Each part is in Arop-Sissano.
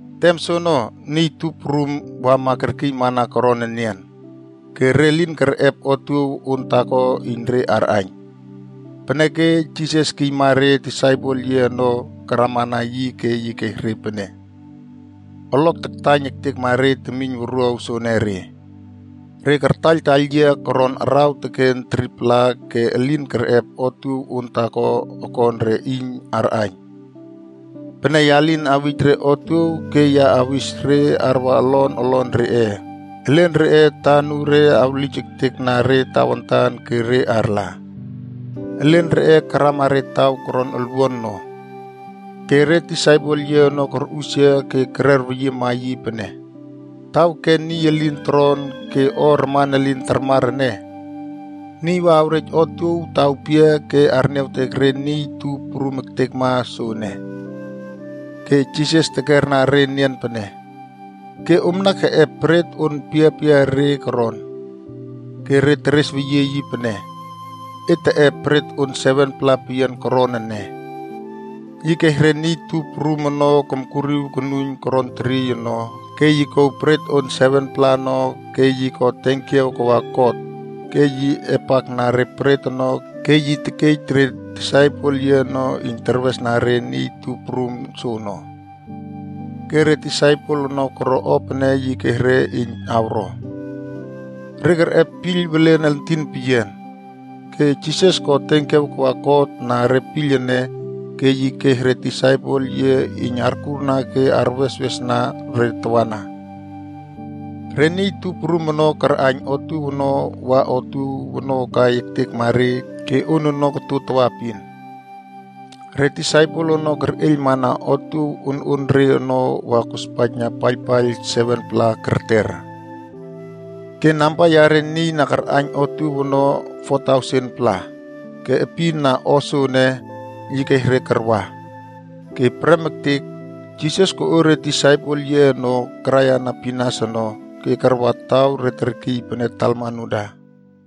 Tem soono, niy tup prum wama kerkiymana koron enian. Ke re lin kerꞌep otuow on taako iyn re arꞌaiyn. Peneke Jisas kiyma re disaipel yiꞌe ono karamana yi ke yi kes re pene, “Olok taktaiyn ektekma re temiyn wuruaw soenere. Re kartaiyltaiyl yia koron araw teken 3-pla ke elin kerꞌep otuow on taako okon re iyn arꞌaiyn. Pene ya lin awij re otuow ke ya awis re arwa olon olon reꞌe, elen reꞌe atanure awlij ektekna re tawantan ke re arla. Elen reꞌe karama re taw koron olwuan no.” Ke re disaipel yiꞌe ono korꞌusia ke kererweyiema yi pene, “Taw ken niy elin toron ke o raman elin tarmar ene, niy wa awrej otuow taw pia ke arniawtek re niy tup prum ektekma soene?” Ke Jisas tekerna re enian pene, “Ke omna keꞌep bret on piapiare koron?” Ke re teresweyie yi pene, “Et teꞌep bret on 7-pla peyian koron ene.” Yi kes re niy tup prum ono komkuriw konuiyn koron teriey ono, ke yi kouw bret on 7-pla ono ke yi ko tenkiaw kawa God, ke yi epakna re bret ono ke yi tekej re disaipel yiꞌe ono iyn terwesna re niy tup prum soono. Ke re disaipel ono koro o pene yi kes re iyn awro. Re kerꞌep piyl welen entin peyian. Ke Jisas ko tenkiaw kawa God na re piyl ene, ke yi kes re disaipel yiꞌe iyn arkurna ke arweswesna re tawana. Re niy tup prum ono karꞌaiyn otuow ono wa otuow ono kai ektekma re ke on ono koto tawaepin. Re disaipel ono kerꞌeiylmana otuow ononre ono wa kospaijna paiylpaiyl 7-pla kerter. Ke namba yare niy na karꞌaiyn otuow ono 4,000-pla. Ke epin na o soene, yi kes re karwa. Ke prem ektek, Jisas koꞌo re disaipel yiꞌe ono karaiyana pinas ono ke karwa taw re terkiy pene Dalmanuta.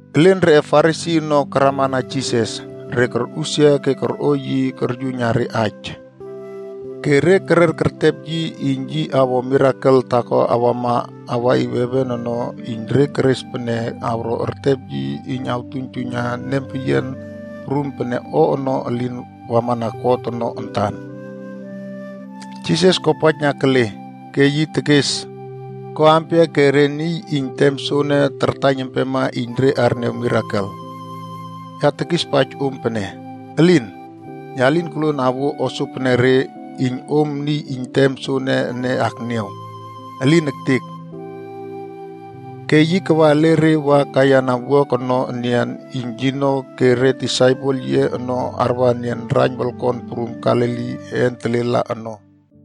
Elen reꞌe Farisi ono karamana Jisas, re korꞌusia ke korꞌo yi koryuiyna re aij. Ke re kerer kertep yi iyn yi awo mirakel taako awama awaꞌiw heven ono iyn re keres pene awro ertep yi iyn artuiynjuiyna nempeyian prum pene o ono elin wamana God ono antan. Jisas kopaijna kele, ke yi tekes, “Ko ampia ke re niy iyn tem soene tartaiyn empema iyn re arniaw mirakel? Ya tekispaij om pene, elin. Ya lin koluon awuo o sopenere iyn om niy iyn tem soene ene akniaw. Elin ektek!” Ke yi kawa ele re wa kaiyana wuak ono enian iyn yino ke re disaipel yiꞌe ono arwa enian raiyn wolkon prum Galili een telela ono.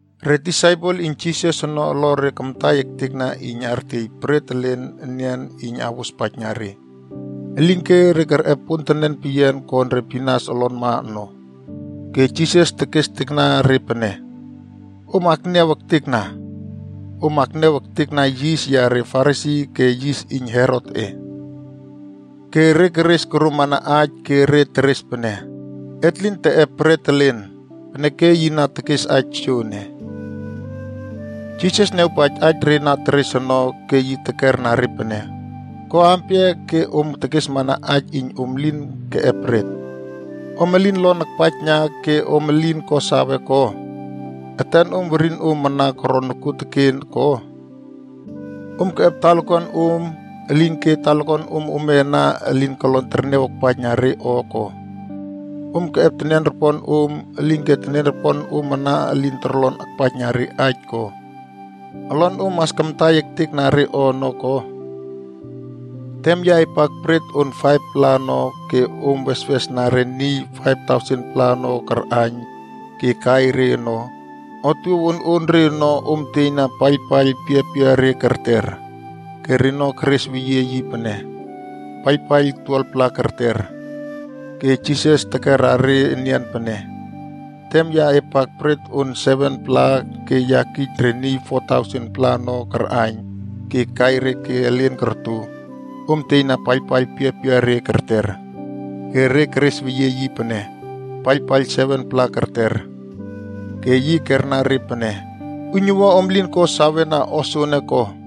Re disaipel iyn Jisas ono olore kamtai ektekna iyn artiey bret elen enian iyn awospaijna re. Elinke re kerꞌep pontenen peyian kon re pinas olonma ono. Ke Jisas tekestekna re pene, “Om akniaw ektekna. Om akniaw ektekna yis yare Farisi ke yis iyn Herotꞌe.” Ke re keres koromana aij ke re teres pene, “Et lin teꞌep bret elen, peneke yi na tekes aij soene.” Jisas niawpaij aij re na teres ono ke yi tekerna re pene, “Ko ampia ke om tekesmana aij iyn om elin keꞌep bret? Om elin lon akpaijna ke om elin ko sawe ko? Etenom werinom ana koro nokuoteken ko? Om keꞌep talakuanom om, elinke talakuanom ome ana elin kolon terniaw akpaijna re o ko? Om keꞌep teniaroponom om, elinke teniaroponom ana elin torlon akpaijna re aij ko? Olonom mas kamtai ektekna re o ono ko? Tem ya epak bret on 5-pla ono ke om weswesna re niy 5,000-pla ono karꞌaiyn ke kai re ono, otuow ononre ono om tieyna paiylpaiyl piapiare kerter?” Ke reno keresweyie yi pene, “Paiylpaiyl 12-pla kerter.” Ke Jisas tekera re enian pene, “Tem ya epak bret on 7-pla ke ya kij re niy 4,000-pla ono karꞌaiyn ke kai re ke elen korto, om tieyna paiylpaiyl piapiare kerter?” Ke re keresweyie yi pene, “Paiylpaiyl 7-pla kerter.” Ke yi kerna re pene “Uiynuwua om lin ko sawena o soene ko?”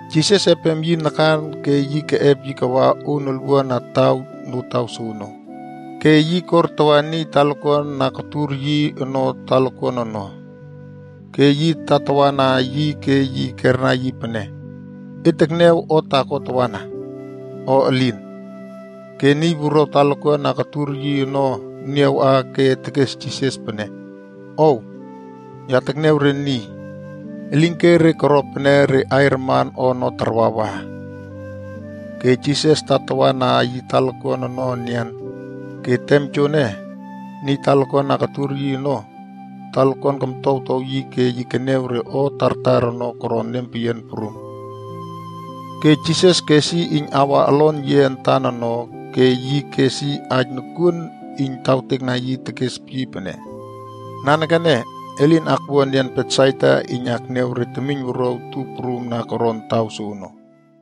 Jisas epem yi nakan ke yi keꞌep yi kawa on olwuan na taw notaw soono, ke yi kortawa niy talakuan na kotur yi ono talakuan ono, ke yi tatawana yi ke yi kerna yi pene, “E tekniaw o taako tawana, o elin?” Ke niy wuruaw talakuan na kotur yi ono niawꞌa ke tekes Jisas pene, “Ow, ya tekniaw re niy. Elinke re koro pene re aiy raman o ono tarwawa.” Ke Jisas tatawa na yi talakuan ono enian. Ke tem joene, niy talakuan na kotur yi ono, talakuan komtowtow yi ke yi keniaw re o tartar ono koron nempeyian prum. Ke Jisas kes yi iyn awa olon yiꞌe antan ono ke yi kes yi aij nokuon iyn tawtekna yi tekes yi pene, “Nanekene, e lin akwua enian Betsaida iyn akniaw re temiynwuruaw tup prum na koron taw soono.”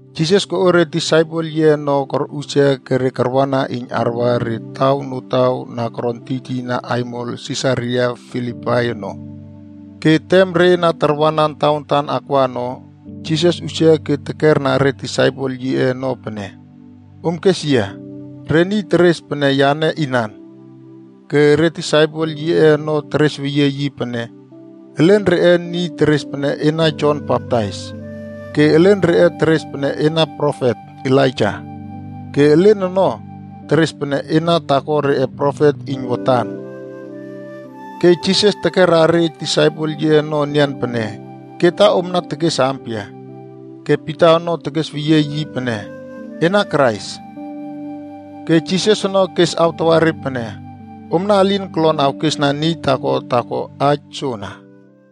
Jisas koꞌo re disaipel yiꞌe ono korꞌusia ke re karwana iyn arwa re taw notaw na koron tiytiyna aimol Sisaria Filipai ono. Ke tem re na tarwanan tawantan akwa ono, Jisas usia ke tekerna re disaipel yiꞌe ono pene, “Om kes yia, re niy teres pene yane inan?” Ke re disaipel yiꞌe ono teresweyie yi pene, “Elen reꞌe niy teres pene ena Jon Baptais. Ke elen reꞌe teres pene ena profet Elaija. Ke elen ono, teres pene ena taako reꞌe profet iyn watan.” Ke Jisas tekera re disaipel yiꞌe ono enian pene, “Ke ta omna tekes ampia?” Ke Pita ono tekesweyie yi pene, “Ena Krais.” Ke Jisas ono kes awtawa re pene, “Omna elin kolon awkesna niy taako taako aij soana.”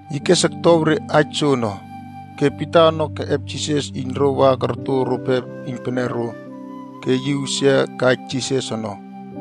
Yi kes oktow re aij soono. Ke Pita ono keꞌep Jisas iyn ro wa korto rope iynpenero, ke yi usia kaij Jisas ono.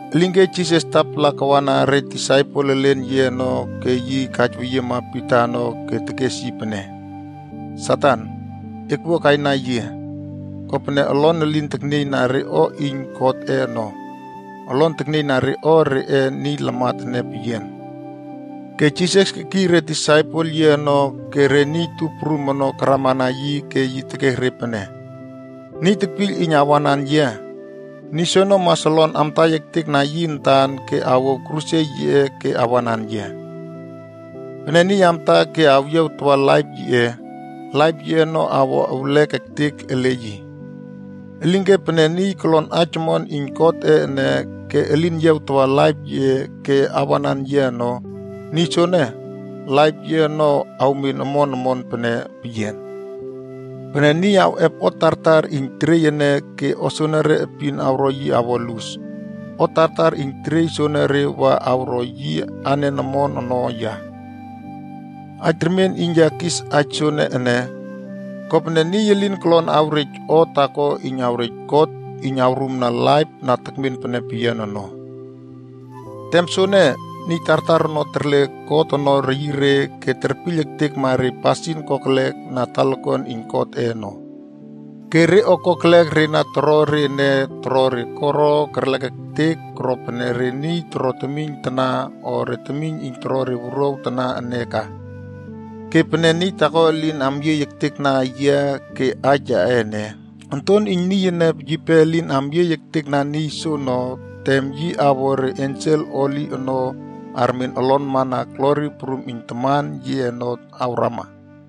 Elinke Jisas tapala kawana re disaipel elen yiꞌe ono ke yi kaijweyiema Pita ono ke tekes yi pene, “Satan, ekwua kaina yia! Kopene olon elin teknieyna re o iyn Godꞌe ono. Olon teknieyna re o reꞌe niy lamat ene peyian.” Ke Jisas kekiy re disaipel yiꞌe ono ke re niy tup prum ono karamana yi ke yi tekes re pene, “Niy tekpiyl iyn awanan yia, niy soono mas olon amtai ektekna yi antan ke awouw kruse yiꞌe ke awanan yia. Pene niy amta ke awyiawtawa laip yiꞌe, laip yiꞌe ono awo ewlek ektek ele yi. Elinke pene niy kolon Aij Omon iyn Godꞌe ene ke elin yiawtawa laip yiꞌe ke awanan yia ono, niy sonee, laip yiꞌe ono awmen omon omon pene peyian. Pene niy awꞌep o tartar iyn teriey ene ke o soenere epin awro yi awo lus, o tartar iyn teriey soenere wa awro yi anen omon ono ya? Aij remien iyn ya kis aij soene ene, kopene niy elin kolon awrej o taako iyn awrej God iyn awrumna laip na tekmen pene peyian ono. Tem soene, niy tartar ono terle God ono reyire ke terpiyl ektekma re pasin kokelek na talakuan iyn Godꞌe ono. Ke re o kokelek re na toro re ene toro re koro kerlek ektek koro pene re niy toro temiyn tana o re temiyn iyn toro re wuruaw tana ene ka. Ke pene niy taako elin amyieyna ektekna yia ke aij yaꞌe ene, Onton iyn Niy ene yipe elin amyieyna ektekna niy soono tem yi awꞌo re ensel holi ono armen olonmana glori prum iyn Taman yiꞌe ono awrama.”